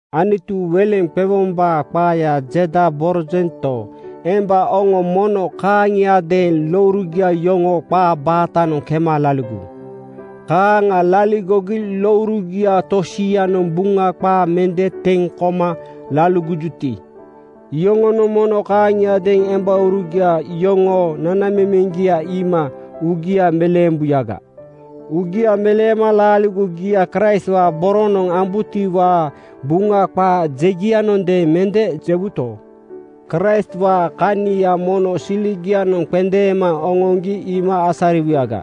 Anutu weleŋ qewombaa qaaya jedaborojento, emba oŋo mono kaaŋiadeeŋ lourugia yoŋoo qaa baatanoŋ kema laligowu. Kaaŋa laligogi lourugia tosianoŋ Buŋa qaa mende teŋ koma laligojuti, iyoŋonoŋ mono kaaŋiadeeŋ embaurugia yoŋoo nanamemeŋgia iima uugia meleembuyaga. Uugia meleema laaligogia Kraistwaa boronoŋ ambutiwaa Buŋa qaa jegianondeeŋ mende jewuto, Kraistwaa kania mono siligianoŋ qendeema oŋoŋgi iima asariwuyaga.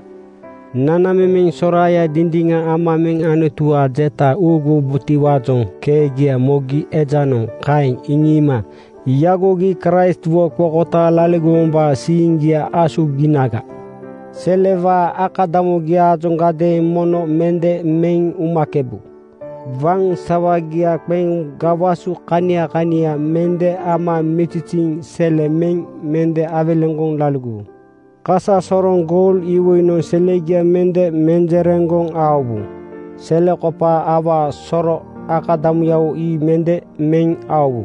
Nanamemeŋ soraaya dindiŋa ama meŋ Anutuwaa jeta uuguwubotiwaajoŋ keegia mogi ejanoŋ kaeŋ iŋiima yagogi Kraistwo qokotaaŋ laligowombaa siiŋgia asuginaga. Selewaa akadamugiajoŋadeeŋ mono mende meŋ umakebu. Waŋ sawagia qeŋ gawasu kania kania mende ama miziziiŋ sele meŋ mende awelegoŋ laligowu. Kasasoroŋ goul iwoinoŋ selegia mende menjereŋgoŋ aowu. Selekopaa awaa soro akadamuyawo ii mende meŋ aowu.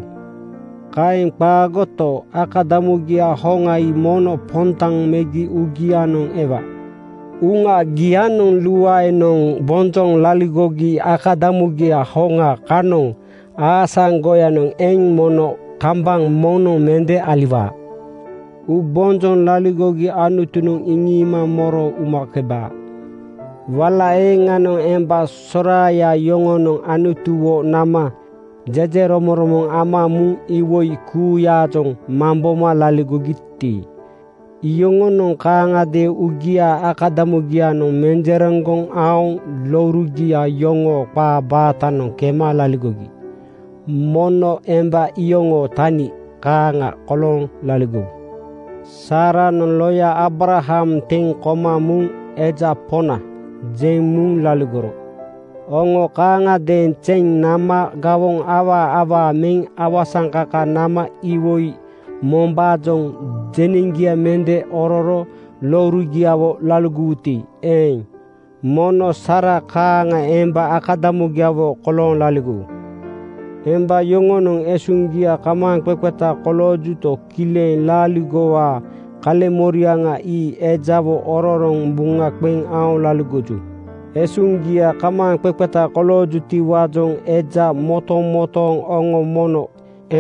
Kaeŋ qaagoto, akadamugia hoŋa ii mono pondaŋ megi uugianoŋ ewa. Uŋagianoŋ luaenoŋ bonjoŋ laligogi akadamugia hoŋa kanoŋ aasaŋgoyanoŋ eŋ mono kambaŋ moŋnoŋ mende aliwaa. Uubonjoŋ laligogi Anutunoŋ iŋiima moro umakebaa. Wala eeŋanoŋ emba soraaya yoŋonoŋ Anutuwo nama jejeromoŋromoŋ ama muŋ iwoi kuuyaajoŋ mamboma laligogiti, iyoŋonoŋ kaaŋagadeeŋ uugiaa akadamugianoŋ menjereŋgoŋ aoŋ lourugia yoŋoo qaa baatanoŋ kema laligogi. Mono emba iyoŋoo tani kaaŋa kolooŋ laligowu. Saaranoŋ loya Aabraham teŋ koma muŋ “Eja Poŋna,” jeŋ muŋ laligoro. Oŋo kaaŋagadeeŋ zeŋ nama gawoŋ awaa awaa meŋ awasaŋkaka nama iwoi mombaajoŋ jeneŋgia mende ororo lourugiawo laligowuti eeŋ, mono Saara kaaŋa emba akadamugiawo kolooŋ laligowu. Emba yoŋonoŋ esuŋgia kamaaŋqeqeta koloojuto, kileŋ laaligowaa kaleŋmoriaŋa ii ejawo ororoŋ buŋa qeŋ aoŋ laligoju. Esuŋgia kamaaŋqeqeta koloojutiwaajoŋ eja motomotooŋ oŋo mono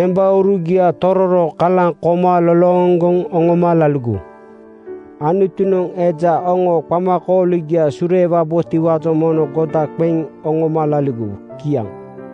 embaurugia tororo kalaŋ koma lolooŋgoŋ oŋoma laligowu. Anutunoŋ eja oŋoo qamakooligia sureewabotiwaajoŋ mono goda qeŋ oŋoma laligowu. Kiaŋ.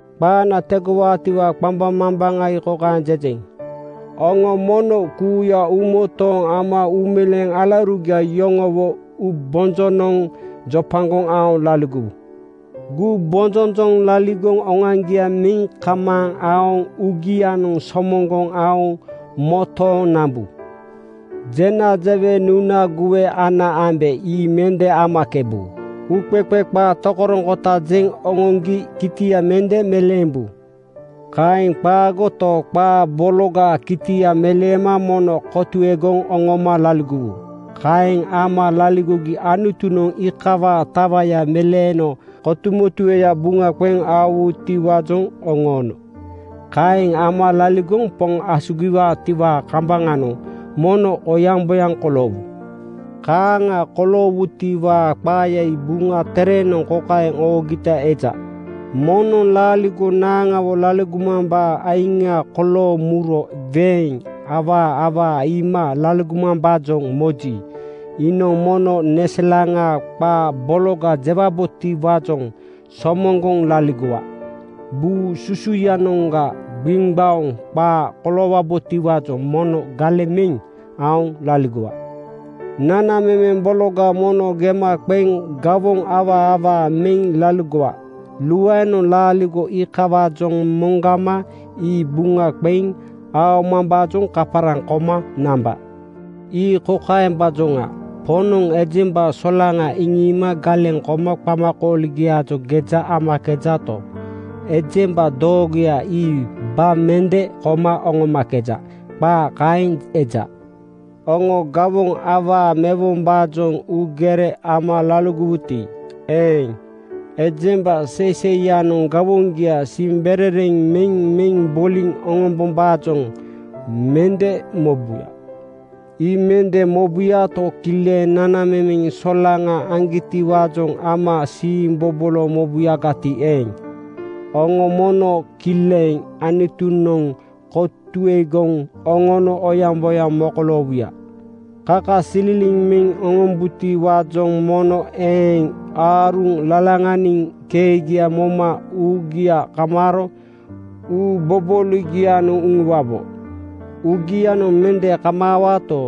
Qaana tegowaatiwaa qambaŋmambaŋa ii kokaeŋ jejeŋ: Oŋo mono kuuya uumotooŋ ama uumeleeŋ alaurugia yoŋowo uubonjonoŋ jopagoŋ aoŋ laligowu. Gumbonjonjoŋ laligoŋ oŋoaŋgia meŋ kamaaŋ aoŋ uugianoŋ somoŋgoŋ aoŋ motooŋ nambu. Jena jewe nuna guwe ana ambe ii mende amakebu. Uuqeqe qaa tokoroŋkota jeŋ oŋoŋgi kitia mende meleembu. Kaeŋ qaagoto, qaa bologaa kitia meleema mono kotuegoŋ oŋoma laligowu. Kaeŋ ama laligogi Anutunoŋ iikawaa tawaya meleeno kotumotueya buŋa qeŋ aowutiwaajoŋ oŋoono. Kaeŋ ama laligoŋ Poŋ asugiwaatiwaa kambaŋanoŋ mono oyaŋboyaŋ koloowu. Kaaŋa koloowutiwaa qaaya ii Buŋa Terenoŋ kokaeŋ oogita eja: “Moŋnoŋ laaligo naaŋawo laligomambaa aiŋa kolooŋ muro weeŋ awaa awaa iima laligomambaajoŋ moji, iinoŋ mono neselaŋa qaa bologa jewabotiwaajoŋ somoŋgoŋ laligowa. Buu susuyanoŋga gbiŋgbaoŋ qaa koloowabotiwaajoŋ mono galeŋ meŋ aoŋ laligowa. Nanamemeŋ bologa mono gema qeŋ gawoŋ awaa awaa meŋ laligowa. Luaenoŋ laaligo iikawaajoŋ moŋgama ii buŋa qeŋ aomambaajoŋ kaparaŋ koma namba. Ii kokaembaajoŋa: Poŋnoŋ ejemba solaŋa iŋiima galeŋ koma qamakooligiaajoŋ geja amakejato, ejemba doogoya ii ba mende koma oŋomakeja.” Qaa kaeŋ eja. Oŋo gawoŋ awaa mewombaajoŋ uugere ama laligowuti eeŋ, ejemba seiseiyanoŋ gawoŋgia siimberereŋ meŋ meŋ boliŋ oŋombombaajoŋ mende mobuya. Ii mende mobuyato, kileŋ nanamemeŋ solaŋa aŋgitiwaajoŋ ama siimbobolo mobuyagati eeŋ, oŋo mono kileŋ Anutunoŋ kotuegoŋ oŋono oyaŋboyaŋ mokoloowuya. Kakasililiŋ meŋ oŋombubotiwaajoŋ mono eeŋ aaruŋ lalaŋaniŋ keegia moma uugia kamaaro uubobooligianoŋ uŋuwabo. Uugianoŋ mende kamaawato,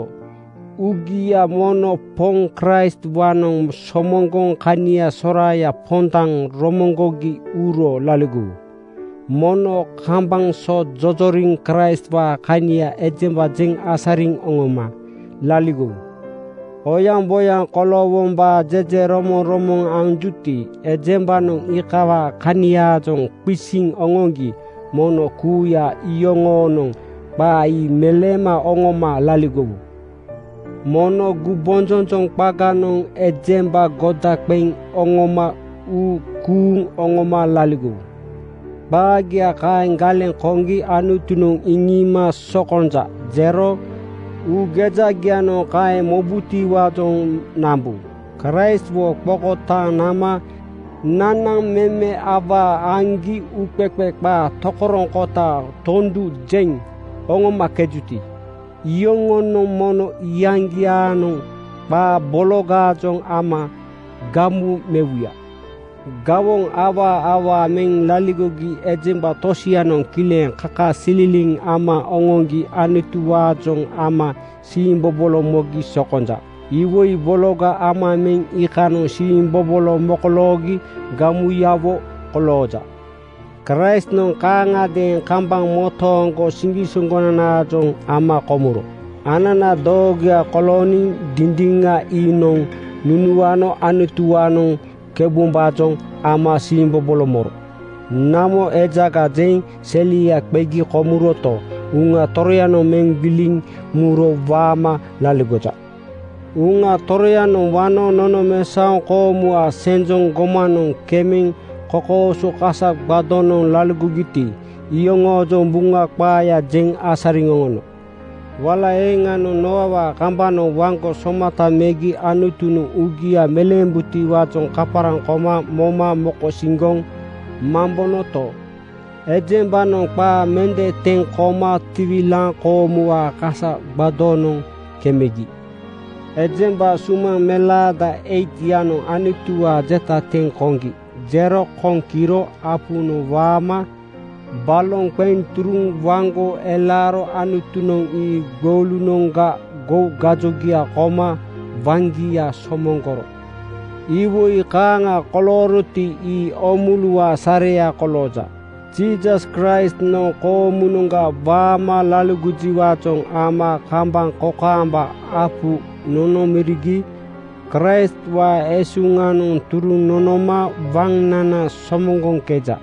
uugia mono Poŋ Kraistwaanoŋ somoŋgoŋ kania soraaya pondaŋ romoŋgogi uro laligowu. Mono kambaŋ so jojoriŋ Kraistwaa kania ejemba jeŋ asariŋ oŋoma laligowu. Oyaŋboyaŋ koloowombaa jejeromoŋromoŋ anjuti, ejembanoŋ iikawaa kaniaajoŋ qisiŋ oŋoŋgi mono kuuya iyoŋoonoŋ qaa ii meleema oŋoma laligowu. Mono gumbonjonjoŋ qaganoŋ ejemba goda qeŋ oŋoma uu kuuŋ oŋoma laligowu. Qaagia kaeŋ galeŋ koŋgi Anutunoŋ iŋiima “Sokonja,” jero uugejagianoŋ kaeŋ mobutiwaajoŋ nambu. Kraistwo qokotaaŋ nama nanamemeŋ awaa aŋgi uuqeqe qaa tokoroŋkota tondu jeŋ oŋomakejuti, iyoŋonoŋ mono iyaŋgiaanoŋ qaa bologaajoŋ ama gamu mewuya. Gawoŋ awaa awaa meŋ laligogi ejemba tosianoŋ kileŋ kakasililiŋ ama oŋoŋgi Anutuwaajoŋ ama siimbobolo mogi sokonja. Iwoi bologa ama meŋ iikanoŋ siimbobolo mokoloogi gamuyawo kolooja. Kraistnoŋ kaaŋagadeeŋ kambaŋ motooŋgo siŋgisoŋgonanaajoŋ ama komuro. Anana doogoya kolooniŋ Dindiŋa iinoŋ nunuano Anutuwaanoŋ keubombaajoŋ ama siimbobolo moro. Namo ejaga jeŋ selia qegi komuroto, Uŋa Toroyanoŋ meŋ gbiliŋ muro waama laligoja. Uŋa Toroyanoŋ wano nonomesaoŋ koomuwaa senjoŋ gomanoŋ kemeŋ kokooso kasa gbadonoŋ laligogiti, iyoŋoojoŋ Buŋa qaaya jeŋ asariŋ oŋono. Wala eeŋanoŋ Nooawaa kambanoŋ waŋgo somata megi Anutunoŋ uugia meleembutiwaajoŋ kaparaŋ koma moma mokosiŋgoŋ mambonoto, ejembanoŋ qaa mende teŋ koma tiwilaaŋ koomuwaa kasa gbadonoŋ kemegi. Ejemba sumaŋ melaada 8:yanoŋ Anutuwaa jeta teŋ koŋgi jero koŋ kiro apunoŋ waama baloŋ qeŋ turuŋ waŋgo elaaro Anutunoŋ ii gboulunoŋga gou gajogia koma waŋgia somoŋgoro. Iwoi kaaŋa kolooroti, ii oomuluwaa sareya kolooja. Jiisas Kraistnoŋ koomunoŋga waama laligojiwaajoŋ ama kambaŋ kokaamba apu nonomorigi Kraistwaa esuŋanoŋ turuŋ nonoma waŋnana somoŋgoŋkeja.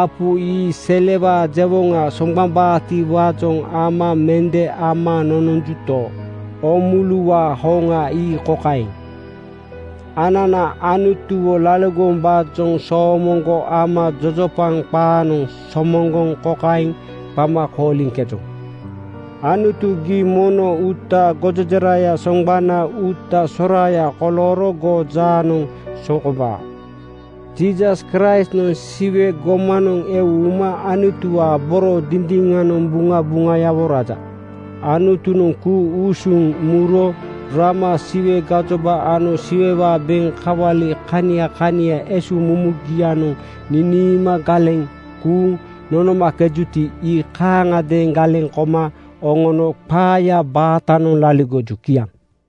Apu ii selewaa jewoŋa soŋgbambaatiwaajoŋ ama mende ama nononjuto, oomuluwaa hoŋa ii kokaeŋ: Anana Anutuwo laligowombaajoŋ soomoŋgo ama jojopaŋ qaanoŋ somoŋgoŋ kokaeŋ qama kooliŋkejoŋ, “Anutu, gii mono uutaa gojejeraya soŋgbana uuta soraaya kolooro goo jaanoŋ sokombaa.” Jiisas Kraistnoŋ Siwe gomanoŋ eu uma Anutuwaa boro dindiŋanoŋ buŋabuŋayawo raja. Anutunoŋ ku-usuŋ muro rama Siwe gajoba ano Siwewaa beŋ kawali kania kania esuŋmumugianoŋ niniima galeŋ kuuŋ nonomakejuti, ii kaaŋiadeeŋ galeŋ koma oŋono qaaya baatanoŋ laligoju. Kiaŋ.